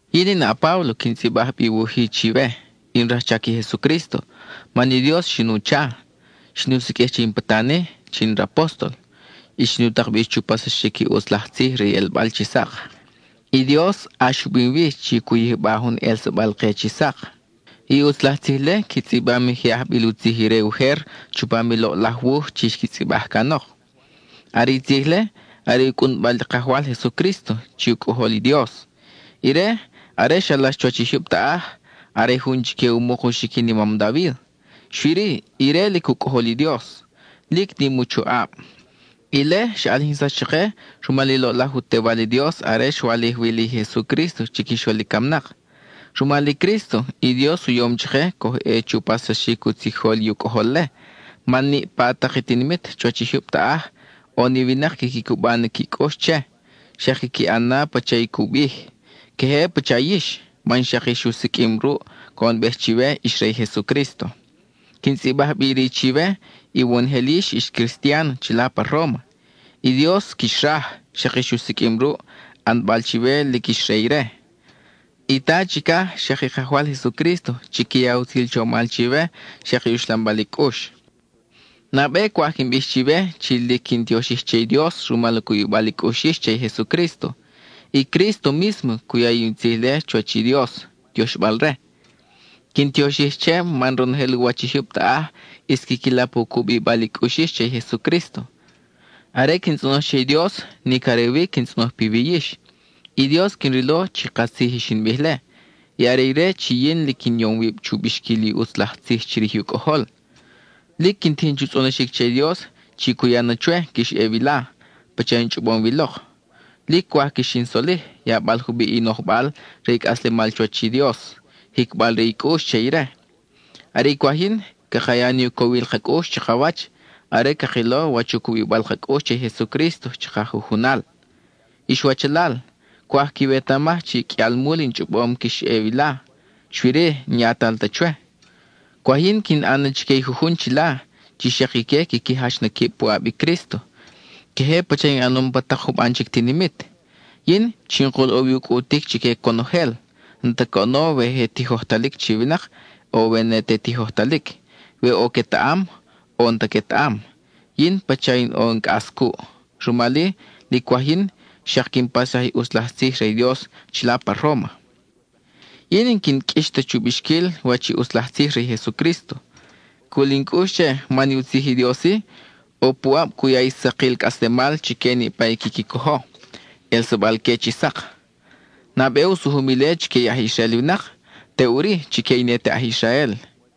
Yin in a-Páblo quin tzʼibaj bi i wuj-i chiwe; in rajchac i Jesucrísto, man i Dios xin u chaʼo; xin u siqʼuij che in patan-i chi in rapóstol, y xin u tak bi chu paxsaxic i ʼutz laj tzij re i ʼelbal chi sak. I Dios ʼax u bim wi chi cu yijba jun ʼelsabal-ke chi sak; i ʼutz laj tzij-le qui tzʼibam i je ajbil u tzij ire ujer chupam i loʼlaj wuj chi xqui tzʼibaj canok. Are i tzij-le, are u cʼunbal i Kajwal Jesucrísto chi u Cʼojol i Dios. Ire, are xalax chuwach i jyub taʼaj, are jun chique u muk u xiquin i mam David, xui-ri, ire lic u Cʼojol i Dios, lic nim u choʼab; ile xa ʼalijinsax chake rumal i loʼlaj u Tewal i Dios are xwalij wi li Jesucrísto chiquixol i camnak. Rumal i Crísto, i Dios u yom chake coj ʼe chu paxsaxic u tzijol i u Cʼojol-le, man niʼpa tak i tinimit chuwach i jyub taʼaj, ʼo ni winak quiqui cuba na qui cʼux che, xak quiqui ʼan na pacha i cu bij, queje pacha yix, man xak ix u siqʼuim ruʼ, coʼonbej chiwe ix re i Jesucrísto. Quin tzʼibaj bi iri chiwe, iwonojel yix ix cristian chila pa Róma; i Dios quix raj, xak ix u siqʼuim ruʼ, ʼanbal chiwe chi lic ix re ire. I Ta chicaj, xak i Kajwal Jesucrísto chiqui ya utzil chomal chiwe, xak i uxlambal i cʼux. Nabe cwaj quin bij chiwe chi lic quin tioxij che i Dios rumal u cubibal i cʼux yix che i Jesucrísto; i Crísto mísmo cu ya in tzij-le chuwach i Dios, tioxbal-re. Quin tioxij che man ronojel u wach i jyub taʼaj ʼis quiqui lap u cubibal i cʼux yix che i Jesucrísto. Are quin tzʼonoj che i Dios, nic are wi quin tzʼonoj piwi yix; i Dios quin rilo chi katzij i xin bij-le, y are ire chi yin lic in yom wib chu bixquil i ʼutz laj tzij chirij u Cʼojol. Lic quin tijin chu tzʼonoxic che i Dios chi cu ya na chwe quix ʼe wila pacha in chʼobom wi lok. Lic cwaj quix in solij, yabal jubiʼ i nojbal re i cʼaslemal chuwach i Dios, jicbal re i cʼux che ire. Are i cwaj yin, caka ya ni u cowil ka cʼux chakawach are cakilo wach u cubibal ka cʼux che i Jesucrísto chaka jujunal. Ix wachalal, cwaj quiwetamaj chi qʼuialmul in chʼobom chi quix ʼe wila, xui-ri n-yatal ta chwe. Cwaj yin quin ʼan na chique jujun chila chi xak ique quiqui jach na quib puʼab i Crísto, queje pacha in ʼanom pa tak juban chic tinimit. Yin, chinkul ʼo wi u cʼutic chique conojel, n-ta coʼono we je tijojtalic chi winak, o we ne te tijojtalic, we ʼo quetaʼam, o n-ta quetaʼam, yin pacha ʼo in cʼas cuʼ. Rumal-i, lic cwaj yin xak quin paxsaj i ʼutz laj tzij re i Dios chila pa Róma. Yin n-quin qʼuix ta chu bixquil wach i ʼutz laj tzij re i Jesucrísto. Cul in cʼux che man i u tzij i Dios-i ʼo puʼab cu ya i sakil cʼaslemal chique niʼpa i quiqui cojo, ʼelsabal-que chi sak. Nabe u sujum ile chique i aj Israel winak, teʼuri chique i ne te aj Israel.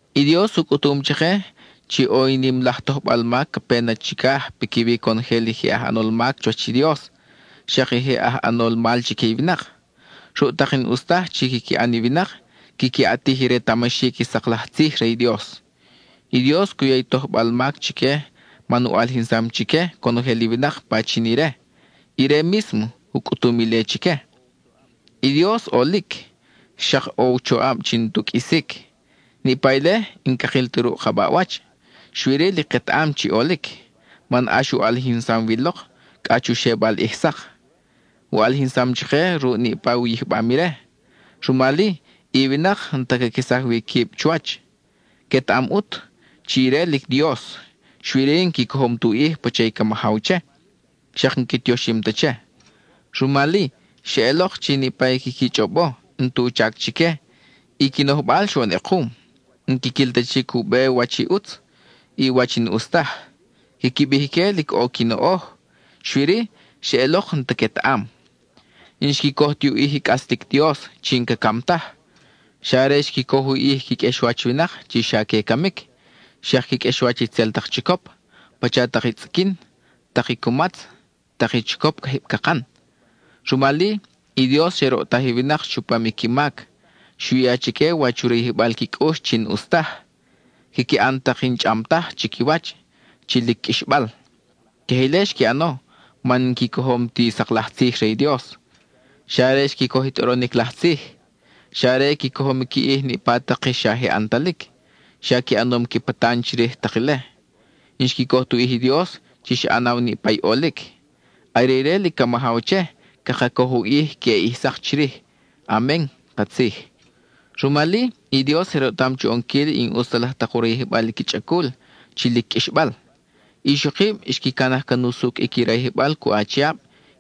I Dios u cʼutum chake chi ʼo i nim laj tojbal mac ca pe na chicaj piquiwi conojel i je aj ʼanol mac chuwach i Dios, xak i je aj ʼanol mal chique i winak. Ruʼ tak i n-ʼus taj chi quiqui ʼan i winak, quiqui ʼatij i retamaxic i sak laj tzij re i Dios. I Dios cu ya i tojbal mac chique man u ʼalijinsam chique conojel i winak pachin ire; ire mísmo u cʼutum ile chique. I Dios lic ʼolic, xak ʼo u choʼab chi n-tu qʼuisic. Niʼpa ile n-cakil ta ruʼ ka baʼwach, xui-ri lic ketaʼam chi ʼolic, man ʼax u ʼalijinsam wi lok cʼa chu xebal ʼij sak. U ʼalijinsam chake ruʼ niʼpa u yijbam ire; rumal-i, i winak n-ta caquesaj wi quib chuwach. Quetaʼam ʼut chi ire lic Dios, xui-ri n-qui cojom tu ʼij pacha i ca majaw che, xak n-qui tioxim ta che. Rumal-i, xeʼelok chi niʼpa i quiqui chʼobo n-tu chac chique; i qui nojbal xoʼon ʼekum, n-quiquil ta chic u be wach i ʼutz, y wach i n-ʼus taj. Quiqui bij ique lic ʼo qui noʼoj, xui-ri, xeʼelok n-ta quetaʼam. N-xqui coj tu ʼij i cʼaslic Dios chi n-ca cam taj; xa are xqui coj u ʼij qui qʼuexwach winak chi xa que camic, xak qui qʼuexwach itzel tak chicop, pacha tak i tzʼiquin, tak i cumatz, tak i chicop cajib cakan. Rumal-i, i Dios xe roʼtaj i winak chupam i qui mac; xu ya chique wach u rayijbal qui cʼux chi n-ʼus taj; quiqui ʼan tak i n-chʼam taj chiquiwach, chi lic qʼuixbal. Queje ile xqui ʼano man n-qui cojom ti sak laj tzij re i Dios, xa are xqui coj i tʼoronic laj tzij. Xa are qui cojom qui ʼij niʼpa tak i xa je ʼantalic, xa qui ʼanom qui patan chirij tak ile; n-xqui coj tu ʼij i Dios chi xa ʼanaw niʼpa i ʼolic. Are ire lic ca majaw che, caka coj u ʼij queʼe ʼij sak chirij. Amen (katzij). Rumal-i, i Dios je roʼtam chu ʼonquil i n-ʼus ta laj tak u rayijbal i qui chʼacul, chi lic qʼuixbal. I ixokib xqui canaj can usucʼ i qui rayijbal cuʼ achiab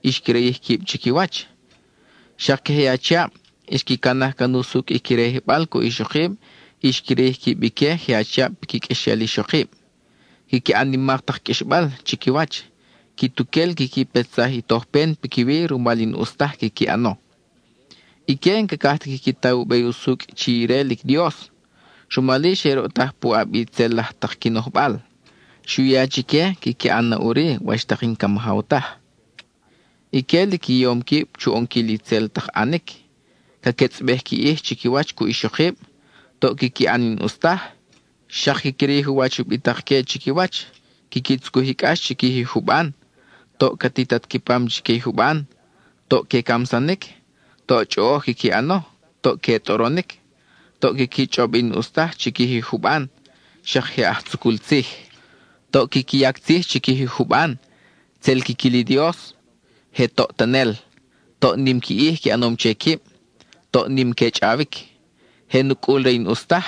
y xqui rayij quib chiquiwach. Xak queje i achiab, xqui canaj can usucʼ i qui rayijbal cuʼ ixokib y xqui rayij quib ique je achiab piqui qʼuexel ixokib. Quiqui ʼan nimak tak qʼuixbal chiquiwach; quituquel quiqui petsaj i tojpen piquiwi rumal i n-ʼus taj quiqui ʼano. Ique n-cacaj ta quiqui ta u be usucʼ chi ire lic Dios, rumal-i, xe roʼtaj puʼab i itzel laj tak qui nojbal. Xu ya chique quiqui ʼan na ʼuri wach tak i n-ca majaw taj. Ique lic qui yom quib chu ʼonquil itzel tak ʼanic; ca quetzʼbej qui ʼij chiquiwach cuʼ ixokib; toʼ quiqui ʼan i n-ʼus taj; xak quiqui rayij u wach ubitak-que chiquiwach; quiqui tzucuj i cʼax chiquij i juban; toʼ ca titat qui pam chique i juban; toʼ que camsanic; toʼ chʼoʼoj quiqui ʼano; toʼ que tʼoronic; toʼ quiqui chʼob i n-ʼus taj chiquij i juban, xak je aj tzucul tzij. Toʼ quiqui yac tzij chiquij i juban; tzel quiquil i Dios; je toʼtanel; toʼ nim qui ʼij qui ʼanom che quib; toʼ nim que chʼawic. Je nucʼul re i n-ʼus taj;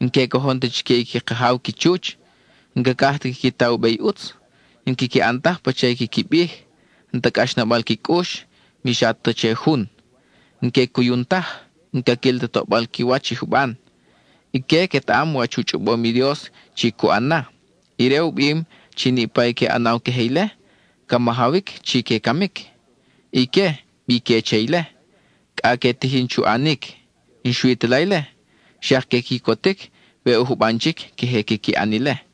n-que cojon ta chique i qui kajaw qui chuch. N-cacaj ta quiqui ta u be i ʼutz; n-quiqui ʼan taj pacha i quiqui bij; n-ta cʼaxnabal qui cʼux, mi xa ta che jun; n-que cuyun taj; n-caquil ta toʼbal qui wach i juban. Ique quetaʼam wach u chʼobom i Dios chi cu ʼan na: ire u bim chi niʼpa i que ʼanaw queje ile, ca majawic chi que camic. Ique, bi que che ile; cʼa que tijin chu ʼanic. N-xui ta la ile, xak que quicotic we ʼo juban chic queje quiqui ʼan ile.